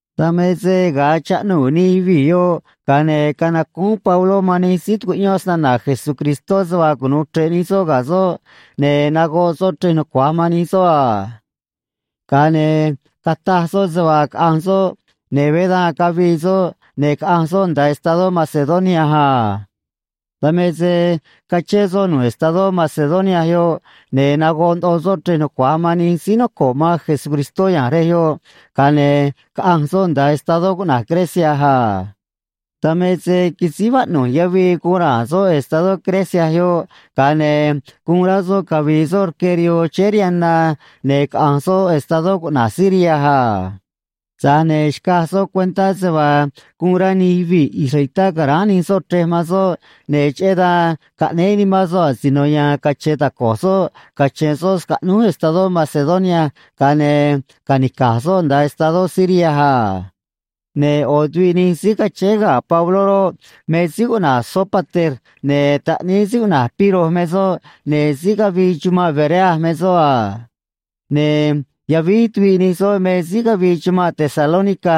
Dan me se ga̱a chaꞌnuu̱ nij yuvii̱ yoꞌ, ga̱a ne̱ canacúún Pabló man nij síí tucuꞌyón snana̱ Jesucristó se vaa cunu̱u chre̱ꞌ nij soꞌ ga̱ soꞌ, ne̱ nagoꞌ soꞌ chrej nucua̱j man nij soꞌ a. Ga̱a ne̱ cataj soꞌ se vaa caꞌa̱nj soꞌ, ne̱ veé dan cavii soꞌ ne̱ caꞌanj soꞌ nda̱a estadó Macedonia a. Dan me se cachén soꞌ nu̱ꞌ estadó Macedonia yoꞌ, ne̱ nagoꞌ ndoꞌo soꞌ chrej nucua̱j man nij síí noco̱ꞌ man Jesucristó ya̱nj rej yoꞌ, ga̱a ne̱ caꞌanj soꞌ nda̱a estadó cuꞌna̱j Grecia a. Dan me se quisíj vaꞌnu̱j yavii guun ra̱a̱n soꞌ estadó Grecia yoꞌ, ga̱a ne̱ guun rá soꞌ cavi̱i̱ soꞌ rque rihoo chéé rihaan na ne̱ caꞌa̱nj soꞌ estadó cuꞌna̱j Siria a. Tza̱j ne̱ xcaj soꞌ cuentá se vaa guun rá nij yuvii̱ israelitá ca̱ráán nij soꞌ chrej man soꞌ, ne̱ cheꞌé dan caꞌnéé nimán soꞌ asino ya̱a̱n cache̱e̱ taco̱j soꞌ cache̱n soꞌ scaꞌnúj estadó Macedonia ga̱a ne̱ ca̱nica̱j soꞌ nda̱a estadó Siria a. Ne̱ ꞌo̱ tuviꞌ nij síí cachéé ga̱ Pabló roꞌ, me síí cuꞌna̱j Sópater, ne̱ taꞌníí síí cuꞌna̱j Piro me soꞌ, ne̱ síí cavii chumanꞌ Berea me soꞌ a. Ne̱ yavíj tuviꞌ nij soꞌ me síí cavii chumanꞌ Tesalónica,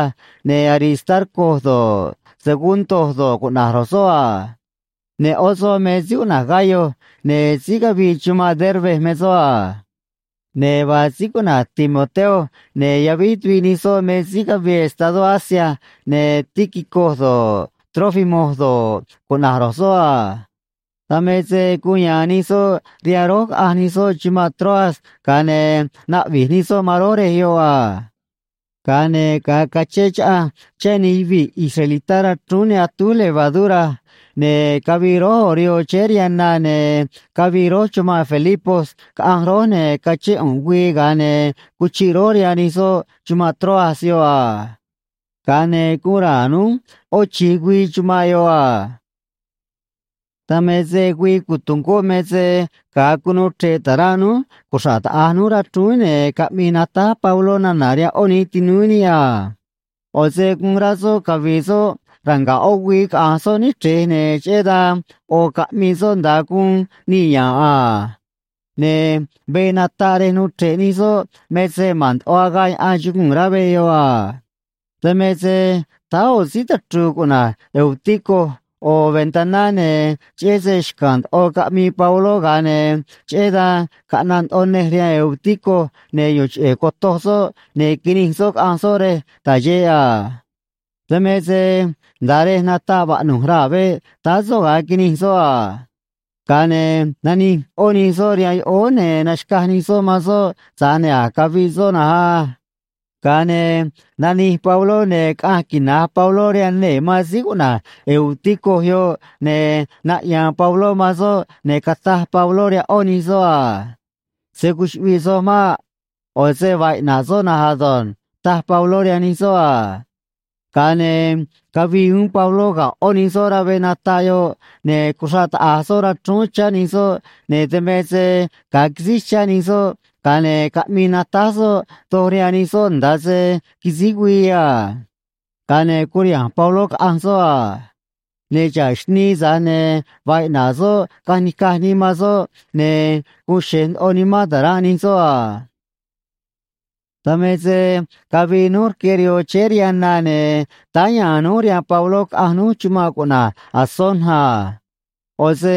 ne̱ Aristarco do̱ꞌ, Segundo do̱ꞌ, cuꞌna̱j ro̱j soꞌ a. Ne̱ ꞌó soꞌ me síí cuꞌna̱j Gayo, ne̱ síí cavii chumanꞌ Derbe me soꞌ a. Ne̱ vaa síí cuꞌna̱j Timoteo, ne̱ yavíj tuviꞌ nij soꞌ me síí cavii estadó Asia, ne̱ Tíquico do̱ꞌ, Trófimo do̱ꞌ, cuꞌna̱j ro̱j soꞌ a. Dan me se guun ya̱a̱n nij soꞌ rihaan rój, caꞌanj nij soꞌ chumanꞌ Troas, ga̱a ne̱ naꞌvi̱j nij soꞌ man rój rej yoꞌ a. Ga̱a ne̱ ga̱a cachén chaꞌanj chá nij yuvii̱ israelitá rachrúún ne atúj levadura, ne̱ cavii rój ꞌo̱ rihoo chéé rihaan na, ne̱ cavii rój chumanꞌ Filipos, caꞌanj rój, ne̱ cachén ꞌu̱nꞌ güii, ga̱a ne̱ cuchiꞌ rój rihaan nij soꞌ chumanꞌ Troas yoꞌ a. Ga̱a ne̱ guun ra̱a̱n núj ꞌó chi̱j güii chumanꞌ yoꞌ a. Dan me se güii cotungó me se ga̱a cunuu chre̱ꞌ ta̱ranꞌ núj cuxra̱ꞌ taꞌa̱j núj rachrúún, ne̱ caꞌmii natáj Pabló nana̱ rihaan ꞌó nij tinúú níꞌ a. ꞌO̱ se guun rá soꞌ cavi̱i̱ soꞌ ranga̱ꞌ ꞌó güii caꞌa̱nj soꞌ níchrej, ne̱ cheꞌé dan ꞌo̱ caꞌmii soꞌ nda̱a guun nii̱ ya̱nꞌ a. Ne̱ veꞌ nataꞌ rej nuu chre̱ꞌ nij soꞌ me se ma̱n ndoꞌo agaꞌ yaꞌan chuguu̱n rá veꞌ yoꞌ a. Dan me se táá ꞌo̱ síí tachru̱u̱ cuꞌna̱j Eutico ꞌo̱ ventaná, ne̱ cheꞌé se xca̱a̱n ndoꞌo caꞌmii Pabló, ga̱a ne̱ cheꞌé dan caꞌnaꞌ ndoꞌo nej rihaan Eutico, ne̱ yu̱u̱n cheꞌe̱ cotoj soꞌ, ne̱ quinij soꞌ caꞌanj soꞌ rej ta̱j xeꞌ a. Dan me se nda̱a rej nataꞌ vaꞌnu̱j raa̱ veꞌ táá soꞌ ga̱a quinij soꞌ a. Ga̱a ne̱ nanij ꞌó nij soꞌ rihaan yoꞌóó, ne̱ naxca̱j nij soꞌ man soꞌ, tza̱j ne̱ a̱j caviꞌ soꞌ na̱nj á. Ga̱a ne̱ nanij Pabló, ne̱ caꞌanj quina̱j Pabló rihaan nee̱ man síí cuꞌna̱j Eutico yoꞌ, ne̱ naꞌya̱a̱n Pabló man soꞌ, ne̱ cataj Pabló rihaan ꞌó nij soꞌ a: ―Se̱ cuchuꞌviꞌ soj maꞌ. ꞌO̱ se vaa iꞌna̱ꞌ soꞌ na̱nj ado̱nj ―taj Pabló rihaan nij soꞌ a. Ga̱a ne̱ cavii uún Pabló ga̱ ꞌó nij soꞌ rá veꞌ nataꞌ yoꞌ, ne̱ cuxraꞌ taꞌa̱j soꞌ rachrúún chá nij soꞌ, ne̱ dan me se ga̱a quisíj chá nij soꞌ, ga̱a ne̱ caꞌmii natáj soꞌ doj rihaan nij soꞌ nda̱a se quisíj güii a. Ga̱a ne̱ curiha̱nj Pabló, caꞌanj soꞌ a. Ne̱ xa̱ꞌ xnii, tza̱j ne̱ vaa iꞌna̱ꞌ soꞌ caꞌanj nica̱j nii man soꞌ, ne̱ guun xe̱j ndoꞌo nimán ta̱ranꞌ nij soꞌ a. Dan me se cavii núj rque rihoo chéé rihaan na, ne̱ táá ya̱a̱n núj rihaan Pabló, caꞌanj núj chumanꞌ cuꞌna̱j Asón a. ꞌO̱ se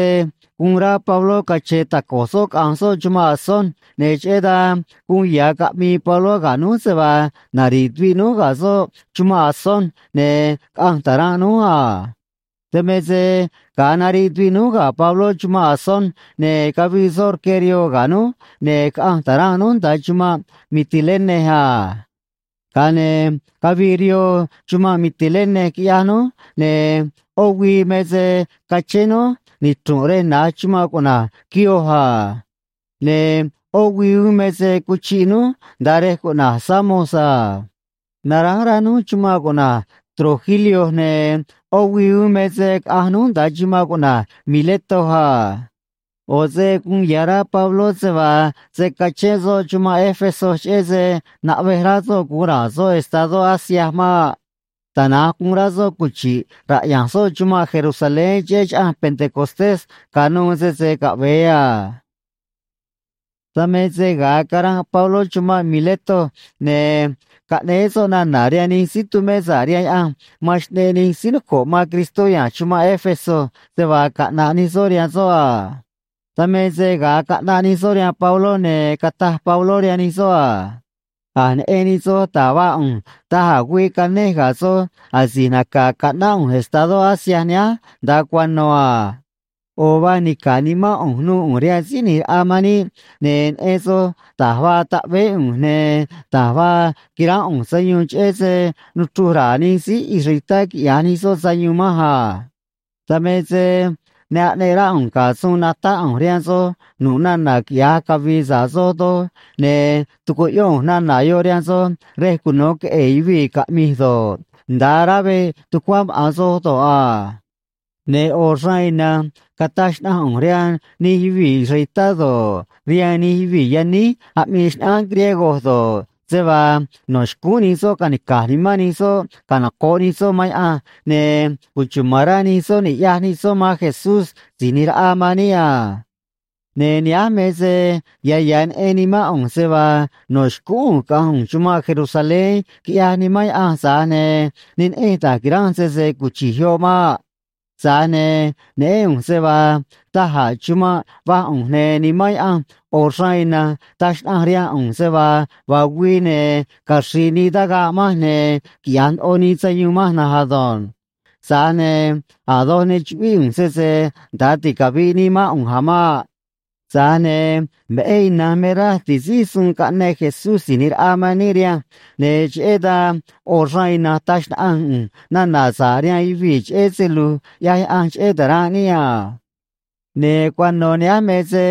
guun rá Pabló cache̱e̱ taco̱j soꞌ caꞌa̱nj soꞌ chumanꞌ Asón, ne̱ cheꞌé dan guun ya̱ caꞌmii Pabló ga̱ núj se vaa nari̱ꞌ tuviꞌ núj ga̱ soꞌ chumanꞌ Asón ne̱ caꞌa̱nj ta̱ranꞌ núj a. Dan me se ga̱a nariꞌ tuviꞌ núj ga̱ Pabló chumanꞌ Asón, ne̱ cavii soꞌ rque rihoo ga̱ núj, ne̱ caꞌanj ta̱ranꞌ núj nda̱a chumanꞌ Mitilene a. Ga̱a ne̱ cavii rihoo chumanꞌ Mitilene, quiꞌyaj núj, ne̱ ꞌó güii me se cachén núj nichru̱nꞌ rej na̱j chumanꞌ cuꞌna̱j Quío a. Ne̱ ꞌó güii uún me se cuchiꞌ núj nda̱a rej cuꞌna̱j Samos a. Naránj rá núj chumanꞌ cuꞌna̱j Trogilio, ne̱ ꞌó güii uún me se caꞌanj núj nda̱a chumanꞌ cuꞌna̱j Mileto a. ꞌO̱ se guun ya̱ rá Pabló se vaa se̱ cachén soꞌ chumanꞌ Éfeso, cheꞌé se naꞌvej rá soꞌ gu̱un ra̱a̱n soꞌ estadó Asia maꞌ. Tana̱nj guun rá soꞌ cuchi̱ꞌ raꞌya̱nj soꞌ chumanꞌ Jerusalén cheꞌé Chaꞌanj Pentecostés ca̱nuû, sese caꞌve̱e a. Dan me se ga̱a caranꞌ Pabló chumanꞌ Mileto, ne̱ caꞌnéé soꞌ nana̱ rihaan nij síí tumé sa̱ꞌ rihaan Yaꞌanj man xꞌneꞌ nij síí noco̱ꞌ man Cristó ya̱nj chumanꞌ Éfeso se vaa caꞌna̱ꞌ nij soꞌ rihaan soꞌ a. Dan me se ga̱a caꞌnaꞌ nij soꞌ rihaan Pabló, ne̱ cataj Pabló rihaan nij soꞌ a: ―A̱j neꞌen nij soj da̱j vaa ꞌu̱nj da̱j a̱ güii canej ga̱ soj asi̱j naca̱ caꞌnáꞌ ꞌu̱nj estadó Asia nihánj nda̱a cuano̱ a. ꞌO̱ vaa nica̱ꞌ nimán ꞌu̱nj nu̱u̱ ꞌu̱nj rihaan Síí ꞌNi̱j Raꞌa man níꞌ, ne̱ neꞌen soj da̱j vaa taꞌveé ꞌu̱nj, ne̱ da̱j vaa quiránꞌ ꞌu̱nj sayuun cheꞌé se nuchruj ra̱a̱ nij síí israelitá quiꞌya̱j nij soꞌ sayuun manj a. Dan me se ne aꞌneꞌ rá ꞌu̱nj ga̱ suun natáꞌ ꞌu̱nj rihaan soj nu̱ꞌ nana̱ quiꞌya̱j cavi̱i̱ sa̱ꞌ soj doj, ne̱ tucuꞌyón ꞌu̱nj nana̱ yoꞌ rihaan soj rej cuno queꞌe̱e̱ yuvii̱ caꞌmij do̱ꞌ, nda̱a rá veꞌ tucuá maꞌa̱n soj do̱ꞌ a. Ne̱ ꞌo̱ xraan ina̱nj cataj xnaꞌanj ꞌu̱nj rihaan nij yuvii̱ israelitá do̱ꞌ, rihaan nij yuvii̱ yaníj aꞌmii xnaꞌánj griego do̱ꞌ, se vaa no̱ xcúún nij soꞌ ca̱nica̱j nimán nij soꞌ canoco̱ꞌ nij soꞌ man Yaꞌanj ne̱ cuchuma̱n rá nij soꞌ ni̱ꞌyaj nij soꞌ man Jesús Si̱j ꞌNi̱j Raꞌa man níꞌ a. ’Ne̱ nihánj me se ya̱ ya̱ neꞌen nimán ꞌu̱nj se vaa no̱ xcúún ꞌu̱nj caꞌa̱nj ꞌu̱nj chumanꞌ Jerusalén, quiꞌyaj Nimán Yaꞌanj, tza̱j ne̱ ne neꞌenj da̱j qui̱ranj sese cuchi̱j yoꞌ maꞌ. Tza̱j ne̱ neꞌén ꞌu̱nj se vaa da̱j a̱ chumanꞌ va̱j ꞌu̱nj, ne̱ Nimán Yaꞌanj ꞌo̱ xraan ina̱nj taj xnaꞌanj rihaan ꞌu̱nj se vaa vaa güii, ne̱ caxri̱i̱ nii tagaꞌ manj ne̱ quiꞌya̱j ndoꞌo nii sayuun manj na̱nj ado̱nj. Tza̱j ne̱ a̱ doj ne chuꞌvíꞌ ꞌu̱nj sese nda̱a ticavi̱ꞌ nii mán ꞌu̱nj a̱ maꞌ. Tza̱j ne̱ veꞌé ina̱nj me raj ti̱síj suun caꞌneꞌ Jesús Si̱j ꞌNi̱j Raꞌa man níꞌ rihanj, ne̱ cheꞌé dan ꞌo̱ xraan ina̱nj taj xnaꞌanj ꞌu̱nj nana̱ sa̱ꞌ rihaan yuvii̱ cheꞌé se lu̱j ꞌyaj Yaꞌanj cheꞌé ta̱ranꞌ níꞌ a. ’Ne̱ cuano̱ nihánj me se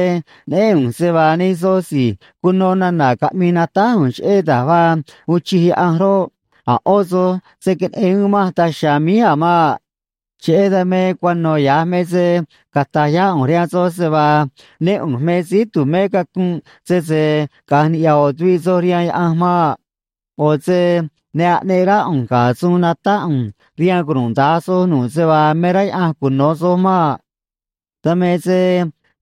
neꞌén ꞌu̱nj se vaa nij soj si̱j cuno nana̱ caꞌmii natáj ꞌu̱nj cheꞌé da̱j vaa uun chij Yaꞌanj roꞌ, a̱ ꞌó soj se̱ queneꞌen uún manj daj chiha̱a̱ míj a̱ maꞌ. Cheꞌé dan me cuano̱ ya̱j me se cata̱j yá ꞌu̱nj rihaan soj se vaa né ꞌu̱nj me síí tu̱mé cacunꞌ sese caꞌa̱nj niꞌya̱ ꞌo̱ tuviꞌ soj rihaan Yaꞌanj maꞌ. ꞌO̱ se ne aꞌneꞌ rá ꞌu̱nj ga̱ suun natáꞌ ꞌu̱nj rihaan cunuda̱nj soj nu̱ꞌ se vaa me rá Yaꞌanj cuno̱ soj maꞌ. ’Dan me se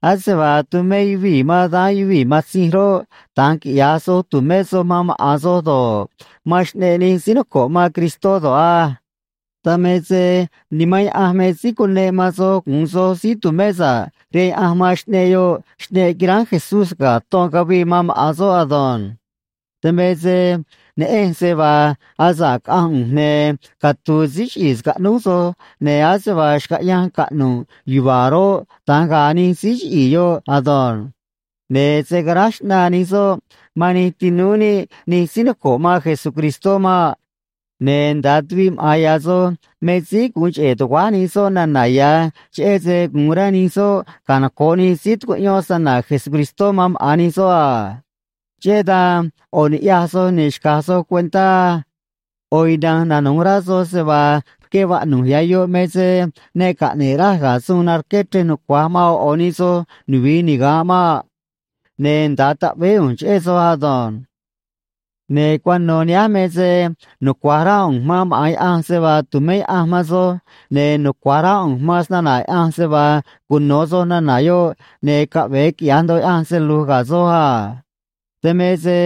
ase vaa tumé yuvii̱ man daán yuvii̱ matzinj roꞌ, da̱nj quiꞌya̱j soj, tu̱mé soj man maꞌa̱n soj do̱ꞌ, man xꞌneꞌ nij síí noco̱ꞌ man Cristó do̱ꞌ á. Dan me se Nimán Yaꞌanj me síí cuneꞌ man soj gu̱un soj síí tu̱mé sa̱ꞌ rihaan Yaꞌanj man xꞌneꞌ yoꞌ, xꞌneꞌ quiránj Jesús ga̱ ton cavii man maꞌa̱n soꞌ ado̱nj. Dan me se neꞌenj se vaa asa̱ꞌ caꞌanj ꞌu̱nj, ne̱ catu̱u̱ síí chiꞌi̱i̱ scaꞌnúj soj, ne̱ ase vaa xcaꞌyanj caꞌnu̱ꞌ yuva̱a̱ roꞌ, da̱nj ga̱a̱ nij síí chiꞌi̱i̱ yoꞌ ado̱nj. Ne̱ se̱ caráj xꞌnaa nij soꞌ man nij tinúú níꞌ nij síí noco̱ꞌ man Jesucristó maꞌ. Ne̱ nda̱a tuviꞌ maꞌa̱n ya̱ soj me síí gu̱un cheꞌe̱ tuguáj nij soꞌ nana̱ ya̱, cheꞌé se gu̱un rá nij soꞌ canoco̱ꞌ nij síí tucuꞌyón snana̱ Jesucristó man maꞌa̱n nij soꞌ a. Cheꞌé dan ꞌo̱ ni̱ꞌyaj soj, ne̱ xca̱j soj cuentá á. ꞌO̱ ina̱nj nanu̱j rá soj se vaa rque vaꞌnu̱j ya̱ yoꞌ me se ne caꞌne̱ꞌ raj ga̱ suun narqué chrej nucua̱j man ꞌo̱ ꞌo̱ nij soj nuvi̱i niga̱nꞌ maꞌ. Ne̱ nda̱a taꞌveé ꞌu̱nj cheꞌé soj ado̱nj. ’Ne̱ cuano̱ nihánj me se nucua̱j rá ꞌu̱nj man maꞌa̱n Yaꞌanj se vaa tu̱mé Yaꞌanj man soj, ne̱ nucua̱j rá ꞌu̱nj man snana̱ Yaꞌanj se vaa cuno̱ soj nana̱ yoꞌ ne̱ caꞌve̱e quiꞌya̱j ndoꞌo Yaꞌanj se lu̱j ga̱ soj a. Dan me se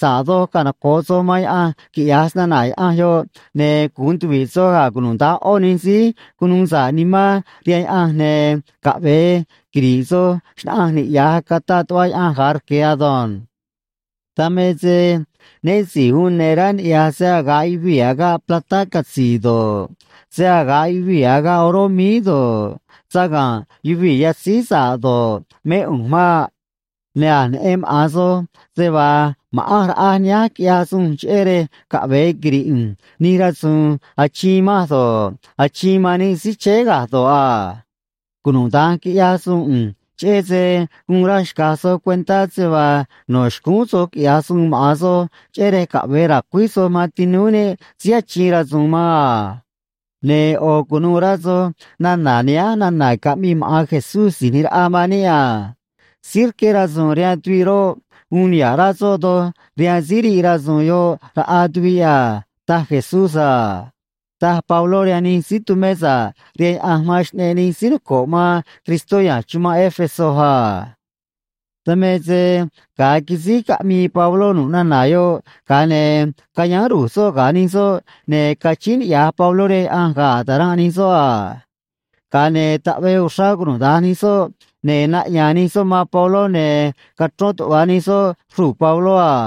sa̱ꞌ doj canoco̱ꞌ soj man Yaꞌanj, quiꞌya̱j snana̱ Yaꞌanj yoꞌ, ne̱ gu̱un tuvi̱ꞌ soj ga̱ cunuda̱nj ꞌó nij síí cunuu sa̱ꞌ nimán rihaan Yaꞌanj, ne̱ caꞌve̱e quiri̱ꞌ soj xnaꞌanj niꞌya̱j cataꞌ tuꞌva Yaꞌanj ga̱a rque̱ ado̱nj. ’Dan me se né si̱j uun ne̱ rá niꞌya̱j se‑aga̱ꞌ yuvii̱ agaꞌ platá catzi̱i̱ do̱ꞌ, se‑aga̱ꞌ yuvii̱ agaꞌ oró míí do̱ꞌ, saga̱nꞌ yuvii̱ yatzíj sa̱ꞌ do̱ꞌ, mé ꞌu̱nj maꞌ. Ne̱ a̱j neꞌen maꞌa̱n soj se vaa ma̱ꞌanj raꞌaj nihánj quiꞌyaj suun cheꞌé rej caꞌvee quiri̱ꞌ ꞌu̱nj nij rasu̱u̱n achiin manj do̱ꞌ, achiin man nij síí chéé ga̱j do̱ꞌ a. Cunuda̱nj quiꞌyaj suun ꞌu̱nj, cheꞌé se guun raj xca̱j soj cuentá se vaa no̱ xcúún soj quiꞌya̱j suun maꞌa̱n soj, cheꞌé rej caꞌve̱e ra̱cuíj soj man tinúú níꞌ síí achiin rasu̱u̱n man a. Ne̱ ꞌo̱ cu̱nuû rá soj nana̱ nihánj nana̱ caꞌmii maꞌa̱n Jesús Si̱j ꞌNi̱j Raꞌa man níꞌ a: “Síí rqué rasu̱u̱n rihaan tuviꞌ roꞌ, uun niha̱ꞌ rá soꞌ doj rihaan síí riꞌ rasu̱u̱n yoꞌ raꞌa tuviꞌ a”, taj Jesús a ―taj Pabló rihaan nij síí tumé sa̱ꞌ rihaan Yaꞌanj man xꞌneꞌ nij síí noco̱ꞌ man Cristó ya̱nj chumanꞌ Éfeso a. Dan me se ga̱a quisíj caꞌmii Pabló nu̱ꞌ nana̱ yoꞌ, ga̱a ne̱ cayáán ru̱j soꞌ ga̱ nij soꞌ, ne̱ cachíín niꞌya̱j Pabló rihaan Yaꞌanj ga̱ ta̱ranꞌ nij soꞌ a. Ga̱a ne̱ taꞌvee uxrá cunuda̱nj nij soꞌ, ne̱ naꞌya̱a̱n nij soꞌ man Pabló, ne̱ cachrón tuꞌva̱ nij soꞌ xruu̱ Pabló a.